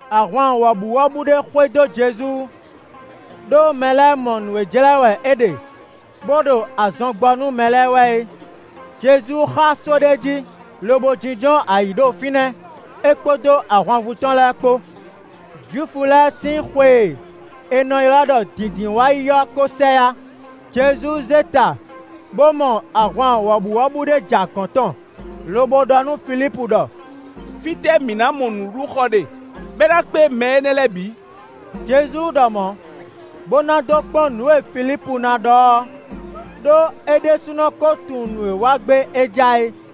Ahwan wɔ̌buwɔ́bú ɖé xwedó Jezu, ɖó mɛ lɛ́ɛ mɔ nǔ e jlɛ́ wɛ é ɖe, bó ɖo azɔn gbɔ nú mɛ lɛ́ɛ wɛ é. Jezu xá só ɖé jí, lobo jínjɔ́n ayǐ ɖo fínɛ́ é kpódó ahwanvú tɔn lɛ́ɛ kpó. Jwifu lɛ́ɛ sín xwe e è nɔ ylɔ́ ɖɔ Dǐndínwáyi ɔ́ ko sɛ yá. Jezu zé ta bó mɔ ahwan wɔ̌buwɔ́bú ɖé ja gɔ̌n tɔn, lobo ɖɔ nú Filípu ɖɔ: “Fítɛ́ mǐ ná mɔ nǔɖuɖu xɔ ɖe, bɔ é ná kpé mɛ énɛ́ lɛ́ɛ bǐ?” Jezu ɖɔ mɔ̌, bó ná dó kpɔ́n nǔ e Filípu ná ɖɔ ɔ́, ɖó é ɖésúnɔ kó tunwun nǔ e wa gbé é ja é.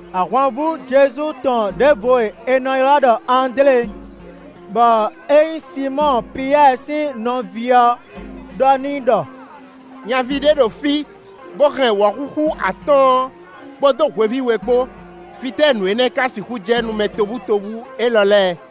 Ahwanvú Jezu tɔn ɖěvo e è nɔ ylɔ́ ɖɔ Andlé, bɔ é nyí Sinmɔ́ɔ Piyɛ́ɛ sín nɔví ɔ́ ɖɔ n'i ɖɔ: “Nyaví ɖé ɖo fí, bó hɛn wɔ̌xúxú atɔ́ɔ́n kpódó hweví we kpó; fítɛ́ nǔ énɛ́ ka sixú jɛ nú mɛ tobutóbú élɔ́ lɛ́ɛ?”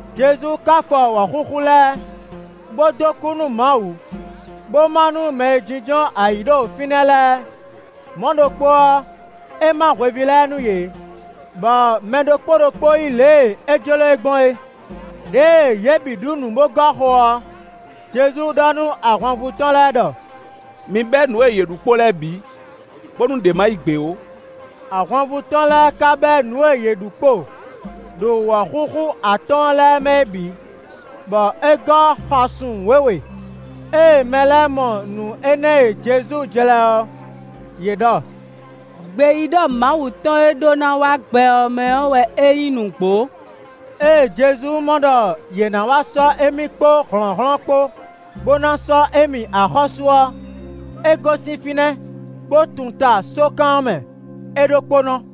Jezu ka fɔ wɔ̌xúxú lɛ́ɛ, bó dó kú nú Mawu, bó má nú mɛ e jínjɔ́n ayǐ ɖo fínɛ́ lɛ́ɛ; mɔ̌ ɖokpó ɔ́, é má hweví lɛ́ɛ nú yě, bɔ mɛ ɖokpó ɖokpó yí lě e é jló e gbɔn é. Đěe yě bǐ ɖu nǔ bó gɔ́ xo ɔ́, Jezu ɖɔ nú ahwanvú tɔn lɛ́ɛ ɖɔ: “Mi bɛ́ nǔ e yě ɖu kpo lɛ́ɛ bǐ, bónú ɖě ma yi gbě ó.” Ahwanvú tɔn lɛ́ɛ ka bɛ́ nǔ e yě ɖu kpo, ɖo wɔ̌xúxú atɔ́ɔ́n lɛ́ɛ mɛ é bǐ, bɔ é gɔ́ xasun wěwe. Ée mɛ lɛ́ɛ mɔ nǔ énɛ́ e Jezu jlɛ́ ɔ́, yě ɖɔ: “Gbeyíɖɔ Mawu tɔn e ɖó ná wá gbɛ ɔ́ mɛ ɔ́ wɛ é nyí nǔgbó.” Ée Jezu mɔ ɖɔ yě ná wá sɔ́ émí kpó hlɔ̌nhlɔ́n kpó, bó ná sɔ́ émí axɔ́sú ɔ́, é gosín fínɛ́, bó tunta sókan ɔ́ mɛ é ɖokpónɔ.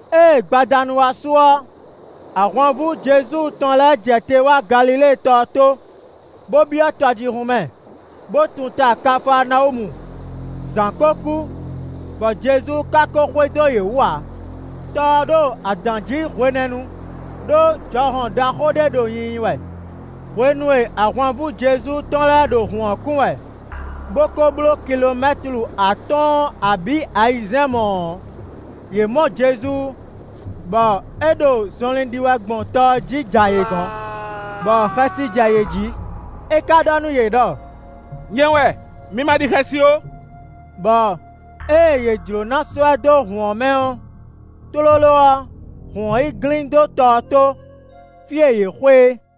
Ée gbadanu wá su ɔ́, ahwanvú Jezu tɔn lɛ́ɛ jɛ te wá Galilée tɔ ɔ́ tó, bó byɔ́ tɔjíhún mɛ, bó tunta Kafaanawúmu; zǎn ko kú, bɔ Jezu ka ko xwedó yě wú ǎ. Tɔ ɔ́ ɖo adǎn jí hwenɛ́nu, ɖó jɔhɔn ɖaxó ɖé ɖo nyinyi wɛ. Hwenu e ahwanvú Jezu tɔn lɛ́ɛ ɖo hǔn ɔ́ kun wɛ, bó ko bló kilomɛ́tlu atɔ́ɔ́n abǐ ayizɛ́n mɔ̌ ɔ́, yě mɔ Jezu, bɔ é ɖo zɔnlin ɖi wɛ gbɔn tɔ ɔ́ jí ja yě gɔ̌n, bɔ xɛsi jɛ yě jí. É ka ɖɔ nú yě ɖɔ: “Nyɛ wɛ, mi ma ɖi xɛsi ó.” Bɔ ée yě jló ná sɔ́ ɛ dó hǔn ɔ́ mɛ ɔ́, tlóló ɔ́, hǔn ɔ́ yi glín dó tɔ ɔ́ tó, fí e yě xwe é.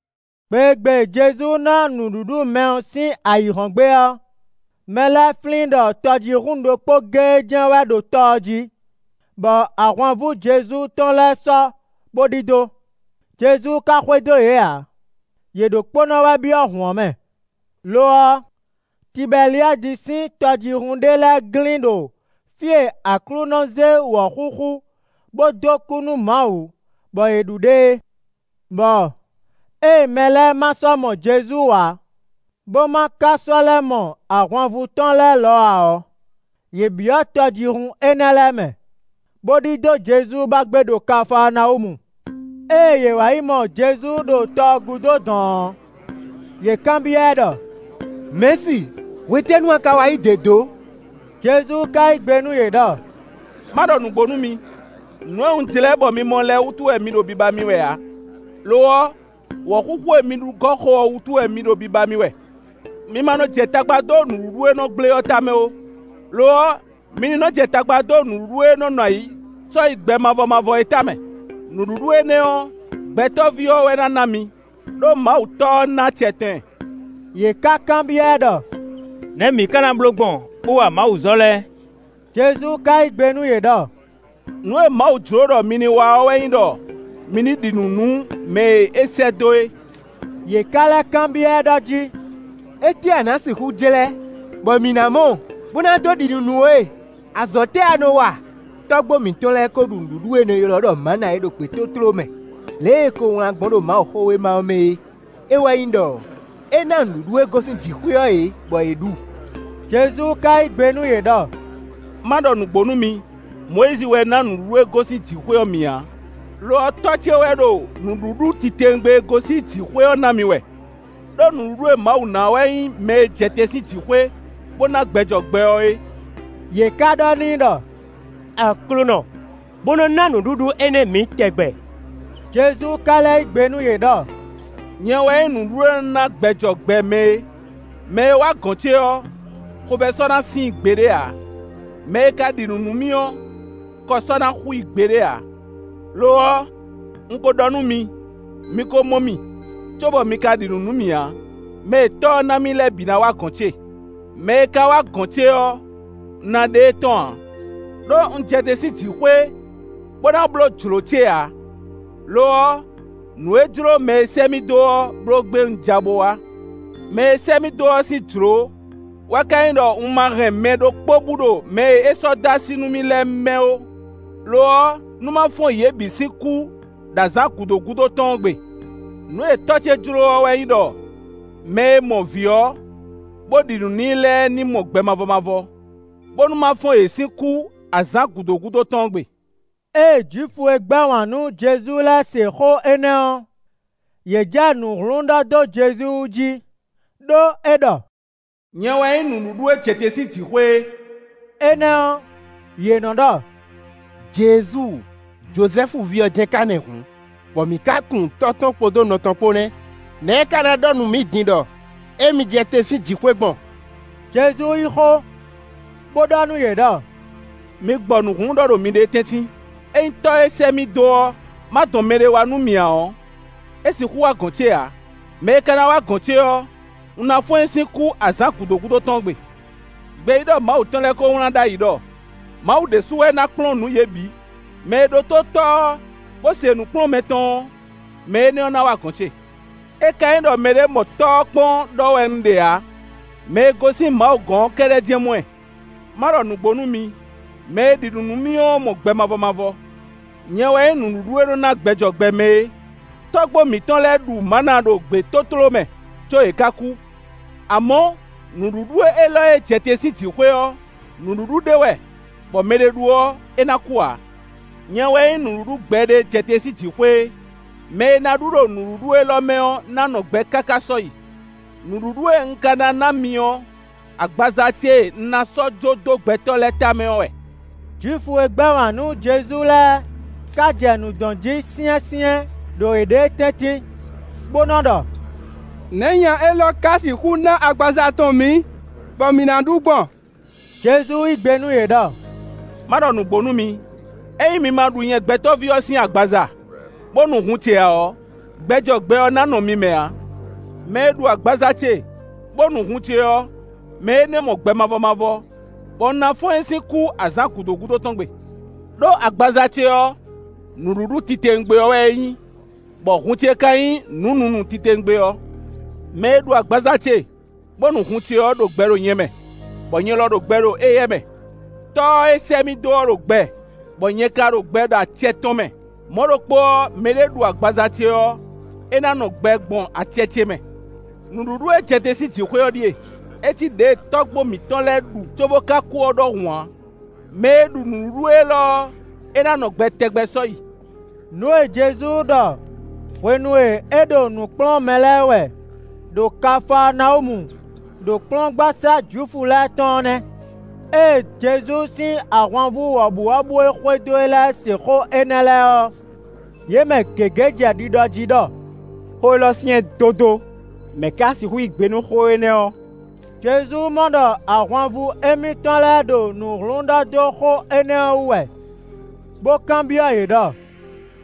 Gbe e gbe Jezu na nǔɖuɖu mɛ ɔ́ sín ayǐhɔ́ngbe ɔ́, mɛ lɛ́ɛ flín ɖɔ tɔjíhún ɖokpó géé jɛ́n wɛ ɖo tɔ ɔ́ jí, bɔ ahwanvú Jezu tɔn lɛ́ɛ sɔ́ bó ɖidó; Jezu ka xwedó yě ǎ, yě ɖokpónɔ wɛ byɔ́ hǔn ɔ́ mɛ. Lo ɔ́, Tibɛliadi sín tɔjíhún ɖé lɛ́ɛ glín ɖo fí e Aklúnɔ zé wɔ̌xúxú bó dó kú nú Mawu bɔ yě ɖu ɖe é. Bɔ ée mɛ lɛ́ɛ ma sɔ́ mɔ Jezu ǎ, bó ma ka sɔ́ lɛ́ mɔ ahwanvú tɔn lɛ́ɛ lɔ ǎ ɔ́, yě byɔ́ tɔjíhún énɛ́ lɛ́ɛ mɛ, bó ɖidó Jezu ba gbé ɖo Kafaanawúmu. Ée yě wǎ yi mɔ Jezu ɖo tɔ ɔ́ gúdo dɔ̌n ɔ́, yě kanbyɔ́ ɛ ɖɔ: “Mɛ̌si, hwetɛ́nu a ka wá yí dě dó?” Jezu ka yí gbe nú yě ɖɔ: “Má ɖɔ nǔgbó nú mi: nǔ e un jlɛ́ bɔ mi mɔ lɛ́ɛ wútu wɛ mi ɖo biba mì wɛ ǎ. Lo ɔ́, wɔ̌xúxú e mi ɖu gɔ́ xo ɔ́ wútu wɛ mi ɖo biba mì wɛ. Mi ma nɔ jɛ tagba dó nǔɖuɖu e nɔ gblé ɔ́ tamɛ ó; lo ɔ́, mi ní nɔ jɛ tagba dó nǔɖuɖu e nɔ́ nɔ ayǐ sɔ́yi gbɛ mavɔ mavɔ é tamɛ. Nǔɖuɖu énɛ́ ɔ́, Gbɛtɔ́ví ɔ́ wɛ ná ná mi, ɖó Mawu Tɔ́ ɔ́ ná acɛ tɔn ɛ.” Yě ká kanbyɔ́ ɛ ɖɔ: “Nɛ̌ mǐ ká ná bló gbɔn, bó wa mawuzɔ̌ lɛ́ɛ?” Jezu ka yí gbe nú yě ɖɔ: “Nǔ e Mawu jló ɖɔ mi ní wa ɔ́ wɛ nyí ɖɔ mi ní ɖi nǔ nú mɛ e é sɛ́ dó é.” Yě ká lɛ́ kanbyɔ́ ɛ ɖɔ jí: “Étɛ́ wɛ a nǎ sixú jlɛ́, bɔ mǐ ná mɔ, bó ná dó ɖi nǔ nú we? Azɔ̌ tɛ́ wɛ a nǎ wa? Tɔ́gbó mǐtɔn lɛ́ɛ kó ɖu nǔɖuɖu e è nɔ ylɔ́ ɖɔ mǎna ɔ́ ɖo gbětótló mɛ lě e è ko wlán gbɔn ɖo Mawuxówéma ɔ́ mɛ é. É wɛ nyí ɖɔ: ‘É ná nǔɖuɖu e gosín jǐxwé ɔ́ yě, bɔ yě ɖu.’” Jezu ka yí gbe nú yě ɖɔ: “Ma ɖɔ nǔgbó nú mi: Mɔyízi wɛ ná nǔɖuɖu e gosín jǐxwé ɔ́ mi ǎ; lo ɔ́, Tɔ́ ce wɛ ɖo nǔɖuɖu titewungbe e gosín jǐxwé ɔ́ ná mi wɛ. Đó nǔɖuɖu e Mawu ná ɔ́ wɛ nyí mɛ e jɛ te sín jǐxwé, bó ná gbɛ jɔ gbɛ ɔ́ é.” Yě ká ɖɔ n'i ɖɔ: “Aklúnɔ! Bo nɔ ná nǔɖuɖu énɛ́ mǐ tɛgbɛ.” Jezu ka lɛ́ yí gbe nú yě ɖɔ: “Nyɛ wɛ nyí nǔɖuɖu e nɔ ná gbɛ jɔ gbɛ mɛ é. Mɛ e wá gɔ̌n ce ɔ́, xovɛ́ sɔ́ ná sin i gbeɖé ǎ. Mɛ e ka ɖi nǔ nú mì ɔ́, kɔ sɔ́ ná xú i gbeɖé ǎ. Lo ɔ́, un ko ɖɔ nú mi; mi ko mɔ mì, cóbɔ mi ka ɖi nǔ nú mì ǎ. Mɛ e Tɔ́ ɔ́ ná mì lɛ́ɛ bǐ ná wá gɔ̌n ce; mɛ e ka wá gɔ̌n ce ɔ́, un ná ɖe e tɔ́n ǎ. Đó un jɛ te sín jǐxwé, bó ná bló jlǒ ce ǎ; lo ɔ́, nǔ e jló mɛ e sɛ́ mì dó ɔ́ bló gbé un ja bo wá. Mɛ e sɛ́ mì dó ɔ́ sín jlǒ wɛ ka nyí ɖɔ un ma hɛn mɛ ɖokpó bú ɖo mɛ e é sɔ́ dó así nú mì lɛ́ɛ mɛ ó; lo ɔ́, nú ma fɔ́n yě bǐ sín kú ɖo azǎn gǔdo gúdo tɔn ɔ́ gbe. Nǔ e Tɔ́ ce jló ɔ́ wɛ nyí ɖɔ mɛ e mɔ Vǐ ɔ́, bó ɖi nǔ n'i lɛ́ɛ ní mɔ gbɛ mavɔ mavɔ, bónú má fɔ́n yě sín kú azǎn gǔdo gúdo tɔn ɔ́ gbe.” Ée Jwifu e gbɛ́ wǎn nú Jezu lɛ́ɛ se xó énɛ́ ɔ́, yě jɛ nǔ hlún ɖɔ dó Jezu wú jí, ɖó é ɖɔ “Nyɛ wɛ nyí nǔɖuɖu e jɛ te sín jǐxwé é.” Énɛ́ ɔ́, yě nɔ́ ɖɔ: “Jezu, Jozɛ́fu ví ɔ́ jɛ́n ka nɛ́ hǔn, bɔ mǐ ka tunwun tɔ́ tɔn kpódó nɔ tɔn kpó nɛ́. Nɛ̌ é ka ná ɖɔ nú mǐ din ɖɔ émí jɛ te sín jǐxwé gbɔn?” Jezu yí xó, bó ɖɔ nú yě ɖɔ: “Mi gbɔ nǔ hlún ɖɔ ɖo miɖée tɛ́ntin. Ényí Tɔ́ e sɛ́ mì dó ɔ́ ma dɔn mɛɖé wá nú mì ǎ ɔ́, é sixú wá gɔ̌n ce ǎ; mɛ e ka ná wá gɔ̌n ce ɔ́, un ná fɔ́n ɛ sín kú azǎn gǔdo gúdo tɔn ɔ́ gbe. Gbeyíɖɔ Mawu tɔn lɛ́ɛ ko wlán ɖ'ayǐ ɖɔ: ‘Mawu ɖésú wɛ ná kplɔ́n nǔ yě bǐ.’ Mɛ e ɖótó Tɔ́ ɔ́, bó se nǔkplɔ́nmɛ tɔn ɔ́, mɛ énɛ́ ná wá gɔ̌n ce. É ka nyí ɖɔ mɛɖé mɔ Tɔ́ ɔ́ kpɔ́n ɖɔ wɛ un ɖe ǎ; mɛ e gosín Mawu gɔ́n ɔ́ kɛ́ɖɛ́ jɛ́n mɔ ɛ.” “Ma ɖɔ nǔgbó nú mi: mɛ e ɖi nǔ nú mì ɔ́ mɔ gbɛ mavɔ mavɔ. Nyɛ wɛ nyí nǔɖuɖu e nɔ́ ná gbɛ jɔ gbɛ mɛ é. Tɔ́gbó mǐtɔn lɛ́ɛ ɖu mǎna ɖo gbětótló mɛ, có yě ká kú. Amɔ̌, nǔɖuɖu élɔ́ e jɛ te sín jǐxwé ɔ́, nǔɖuɖu ɖé wɛ bɔ mɛɖé ɖu ɔ́, é ná kú ǎ. Nyɛ wɛ nyí nǔɖuɖu gbɛɖe e jɛ te sín jǐxwé é. Mɛ e ná ɖu ɖo nǔɖuɖu élɔ́ mɛ ɔ́ ná nɔ gbɛ káká sɔ́yi. Nǔɖuɖu e un ka ná ná mi ɔ́, agbaza ce e un ná sɔ́ jó dó gbɛtɔ́ lɛ́ɛ tamɛ ɔ́ wɛ.” Jwifu e gbɛ́ wǎn nú Jezu lɛ́ɛ ka jɛ nǔ dɔn jí syɛ́nsyɛ́n ɖo yěɖée tɛ́ntin bo nɔ ɖɔ: “Nɛ̌ nya élɔ́ ká sixú ná agbaza tɔn mǐ, bɔ mǐ na ɖu gbɔn?” Jezu yí gbe nú yě ɖɔ: “Má ɖɔ nǔgbó nú mi: ényí mi ma ɖu nyɛ Gbɛtɔ́ví ɔ́ sín agbaza, bó nu hun ce ǎ ɔ́, gbɛ jɔ gbɛ ɔ́ ná nɔ mi mɛ ǎ. Mɛ e ɖu agbaza ce, bó nu hun ce ɔ́, mɛ énɛ́ mɔ gbɛ mavɔ mavɔ, bɔ un ná fɔ́n ɛ sín kú azǎn gǔdo gúdo tɔn gbe. Đó agbaza ce ɔ́, nǔɖuɖu titewungbe ɔ́ wɛ é nyí, bɔ hun ce ka nyí nǔ nunu titewungbe ɔ́. Mɛ e ɖu agbaza ce, bo nu hun ce ɔ́ ɖo gbɛ ɖo nyɛ mɛ, bɔ nyɛ lɔ ɖo gbɛ ɖo éyɛ́ mɛ. Tɔ́ ɔ́ e sɛ́ mì dó ɔ́ ɖo gbɛ, bɔ nyɛ ka ɖo gbɛ ɖo acɛ tɔn mɛ. Mɔ̌ ɖokpó ɔ́, mɛɖé ɖu agbaza ce ɔ́, é ná nɔ gbɛ gbɔn acɛ ce mɛ. Nǔɖuɖu e jɛ te sín jǐxwé ɔ́ ɖíe; é cí ɖěe tɔ́gbó mitɔn lɛ́ɛ ɖu cóbó ka kú ɔ́ ɖɔhun ǎ; mɛ e ɖu nǔɖuɖu élɔ́ ɔ́, é ná nɔ gbɛ tɛgbɛ sɔ́yi.” Nǔ e Jezu ɖɔ hwenu e é ɖo nǔ kplɔ́n mɛ lɛ́ɛ wɛ ɖo Kafaanawúmu ɖo kplɔ́ngbasá Jwifu lɛ́ɛ tɔn ɔ́ nɛ́. Ée Jezu sín ahwanvú wɔ̌buwɔ́bú e xwedó e lɛ́ɛ se xó énɛ́ lɛ́ɛ ɔ́, yě mɛ gěgé jɛ ɖiɖɔ jí ɖɔ: “Xó élɔ́ syɛ́n dódó; mɛ ka sixú yí gbe nú xó énɛ́ ɔ́?” Jezu mɔ ɖɔ ahwanvú émítɔn lɛ́ɛ ɖo nǔ hlún ɖɔ dó xó énɛ́ ɔ́ wú wɛ, bó kanbyɔ́ yě ɖɔ: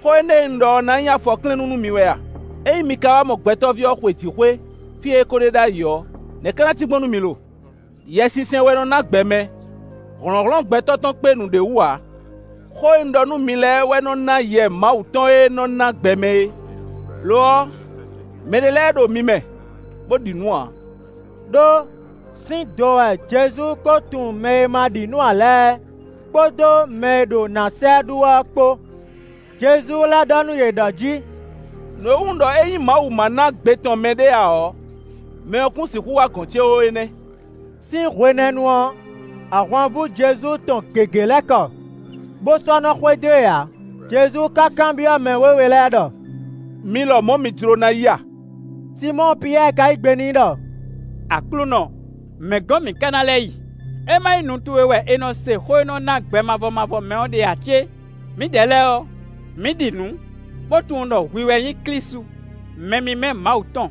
“Xó énɛ́ e un ɖɔ ɔ́ ná nyí afɔklɛ́nnú nú mi wɛ a? Ényí mi ka wá mɔ Gbɛtɔ́ví ɔ́ xwe jǐxwé fí e é ko ɖe ɖ'ayǐ ɔ́, nɛ̌ ka ná cí gbɔn nú mi lo? Yɛsinsɛn wɛ nɔ ná gbɛ mɛ; hlɔ̌nhlɔ́n gbɛtɔ́ tɔn kpé nǔɖé wú ǎ. Xó e un ɖɔ nú mi lɛ́ɛ wɛ nɔ ná Yɛ Mawu tɔn e nɔ ná gbɛ mɛ é. Lo ɔ́, mɛɖé lɛ́ɛ ɖo mi mɛ bó ɖi nǔ ǎ.” Đó sín do wɛ Jezu ko tunwun mɛ e ma ɖi nǔ ǎ lɛ́ɛ, kpódó mɛ e ɖo ná sa ɛ ɖu wɛ ɔ́ kpó. Jezu lɛ́ ɖɔ nú yě ɖɔ jí: “Nǔ e wú un ɖɔ ényí Mawu ma ná gbe tɔn mɛɖé ǎ ɔ́, mɛ ɔ́ kún sixú wá gɔ̌n ce ó é nɛ́.” Sín hwenɛ́nu ɔ́, ahwanvú Jezu tɔn gěgé lɛ́ kɔ, bó sɔ́ nɔ xwedó e ǎ. Jezu ka kanbyɔ́ mɛ wěwe lɛ́ɛ ɖɔ: “Mi lɔmɔ̌ mi jló ná yi a?” Sinmɔ́ɔ Piyɛ́ɛ ka yí gbe n'i ɖɔ: “Aklúnɔ! Mɛ̌ gɔ́n mǐ ka ná lɛ́ yi? É má nyí nu towe wɛ è nɔ se xó e nɔ ná gbɛ mavɔ mavɔ mɛ ɔ́ ɖe ǎ cé? Mǐdɛɛ lɛ́ɛ ɔ́, mǐ ɖi nǔ, bó tunwun ɖɔ hwi wɛ nyí Klísu, mɛ mímɛ́ Mawu tɔn.”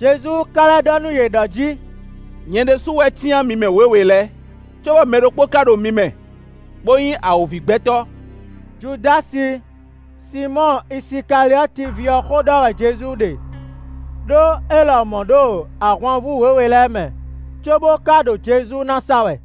Jezu ka lɛ́ ɖɔ nú yě ɖɔ jí: “Nyɛ ɖésú wɛ cyán mi mɛ wěwe lɛ́ɛ, cóbɔ mɛ ɖokpó ka ɖo mi mɛ bó nyí awǒvigbɛtɔ́.” Judási Sinmɔ́ɔ Isikaliɔ́ti ví ɔ́ xó ɖɔ wɛ Jezu ɖe; ɖó é lɔmɔ̌ ɖo ahwanvú wěwe lɛ́ɛ mɛ, cóbó ka ɖo Jezu ná sa wɛ.